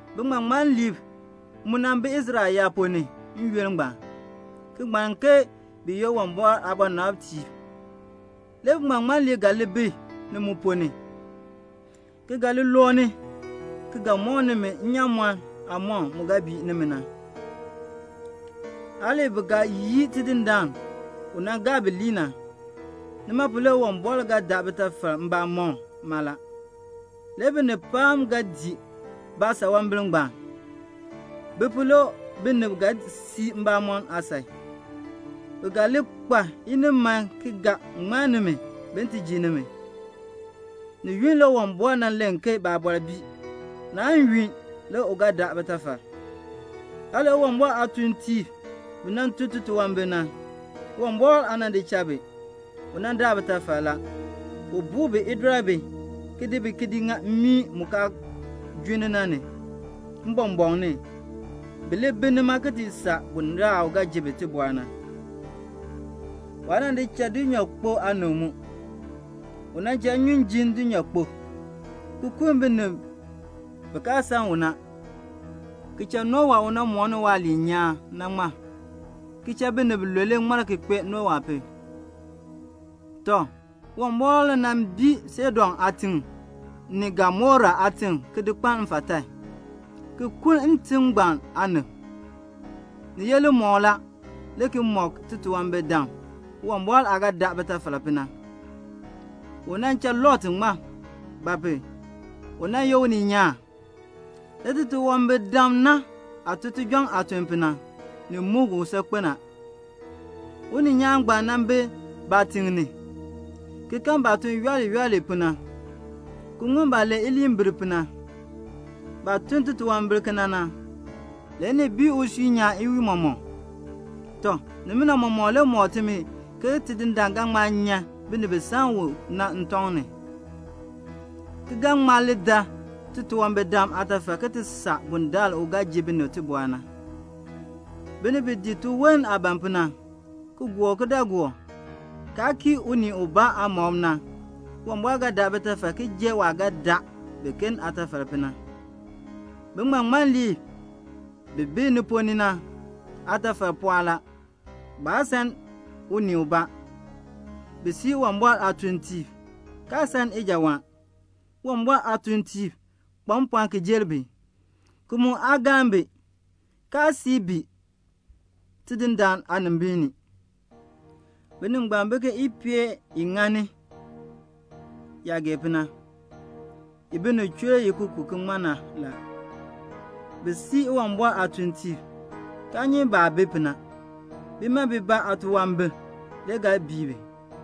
Biŋmaŋmanliib mu nan bi Israel yaab ponn ni n-yoonn ngbaan, ki ŋmann ke bi ye Uwumbɔr aabɔnabtiib. Le biŋmaŋmanliib ga li bi ni mu ponn ni, ki ga li looni ki ga mɔk nimi nnyaamɔn aamɔkm mu ga bii nimi na. Hali bi ga yii Tidindaan u nan gaa bi lii na. Nima pu le Uwumbɔr ga daa bitafal mbamɔm mala. Le binib pam ga dii baasanwambir ngbaan. Bi pu le binib ga sii mbamɔn aasan. Bi ga li kpa iniman ki ga ŋmann nimi, bin ti ji nimi. Ni yunn le Uwumbɔr nan len ke baabɔr bii. Naan yunn le u ga daa bitafal. Hali Uwumbɔr aatuuntiib bi nan tun titunwambir na, Uwumbɔr aa nan di cha bi. U daa bitafal la. U buu bi idɔribi, ki di bi ki di lii mmii mu kaan junn na ni, mbɔmbɔɔn ni, bi li bi nima ki ti saa bundaln u ga ji bi tibɔr na. Waa nan di cha dulnyaakpok aanib mu. U nan cha nnyun jin dulnyaakpok, ki kuln binib bi kaa san u na; ki cha Nowa u nan mooni waaliin nyaan na ŋmar; ki cha binib bilule ŋmar ki kpee Nowa pu. Tɔ, Uwumbɔr nan bii Sodom aatiŋ ni Gomora aatiŋ ki di kpaln mfatan, ki kuln ntim ngbaan aanib. Ni ye limɔkl la, le ki mɔk titunwambirdam Uwumbɔr aah ga daa bitafal pu na. U nan cha Lot ŋmar; ba pu? u nan ye uninyaan; le titunwambirdam na aah tun tijɔŋ aatuln pu na, ni muk u saakpen a. Uninyaan ngbaan nan bi baatiŋ ni, ki kan baah tun yooli yooli pu na, ki ŋun baah len iliinbir pu na. Baah tun titunwambir kena na, le ni bii usui nyaan iwiin mɔmɔk. Tɔ, nimina mɔmɔk le mɔk timi ke Tidindaan ga ŋma nyan binib bi san u na ntɔŋ ni, ki ga ŋma dar titunwambirdam aatafal ki ti saa bundaln u ga ji bi tibɔr na. Binib bi dii tiwon aah ban pu na, ki gɔr kidaagook, kaa kii unii ubaa aamɔb na, Uwumbɔr ga daa bitafal ki jer waah ga daa biken aatafal pu na. Biŋmaŋmanliib bi bi ni ponn ni na aatafal pɔɔ la. Baa san unii ubaa. Bi sii Uwumbɔr aatuuntiib, kaa san ijawaan. Uwumbɔr aatuuntiib kpa mpɔɔn ki jer bi, ki mu aa galn bi ki sii bi Tidindaan aanimbiin ni. Binib ngbaan bi ke ipeel i ŋani yaah gee pu na, i binib chur i ki ku i na. Bi sii Uwumbɔr aatuuntiib, kaa nyi baah bi pu na. Bima bibaa aatunwambir le ga bii bi.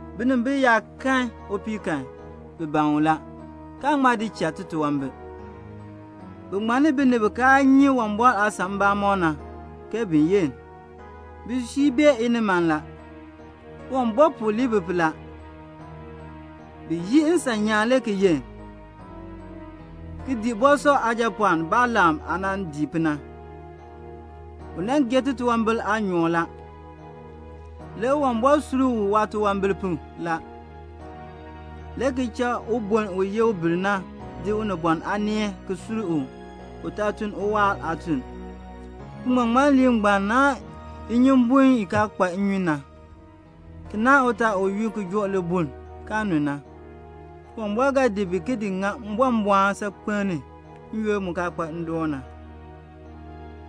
Binimbil yaa kan upii kan, bi ban u la, kaan ŋma di cha titunwambir. Bi ŋmanni binib bi kaa nyi Uwumbɔr aasan mbamɔm na bin ti yenn. Bisui bae iniman la. Uwumbɔr puu lii bi pu la. Bi yii nsan nyaan le ki yenn, ki dii Bosor aajapɔɔn Balaam aah nan dii pu na. U nan gee titunwambir aanyoor la. Le Uwumbɔr sur u waatunwambir pu la, le ki cha ubon u ye ubir na di unibɔn aaneel ki sur u, u taa tun uwaar aatuln. Biŋmaŋmanliib ngbaan naahn inyumbun i kaa kpa nnyun na, ki naahn utaal u yu ki bɔln ki joo libuln kaa nu na. Uwumbɔr ga di bi ki di ŋa mbɔmbɔɔn saakpen ni n-yoonn mu kaa kpa ndoon na.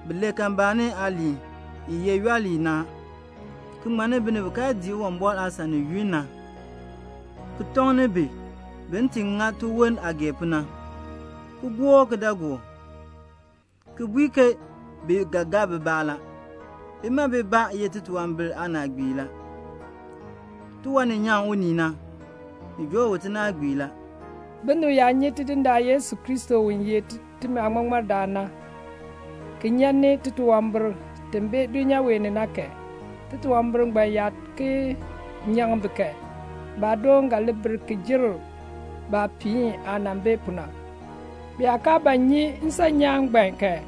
Bi len kalmbaani aaliin i ye yooli na, ki ŋmanni binib bi kaa dii Uwumbɔr aasan ni yunn na, ki tɔŋ bi bin ti ŋa tiwon aah gee pu na ki gɔr kidaagook, ki bui bi ke bi ga gaa bibaa la. Bima bibaa ye titunwambir aanaagbiib la; tiwan ni nyaŋ unii na, ni joo u tinaagbiir la. Binib yaa nyi Tidindaan Yesu Kristo u ye timi Aaŋmaŋmardaan na, ki nyan ni titunwambir ti bi dulnyaa wee ni na kan, titunwambir ngbaan yaa ki nyaŋ bi kan, baadoon ga li bir ki jer baapiin aah nan bi pu na. Bi yaa kaa ba nyi nsan nyaan ngbaan kan,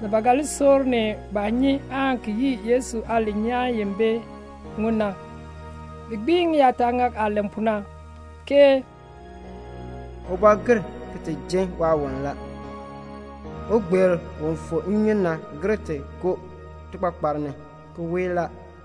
ni ba ga li soor ni baah nyi aan ki yii Yesu aaliin nyaan i bi ŋun na. Bi gbiin ŋiyaataŋak aah len pu na, ke "Ubɔ gir ki ti jin waawoln la. Ugbeer u fu nnyun na gir ti koo tikpakpar ni, ki weei la."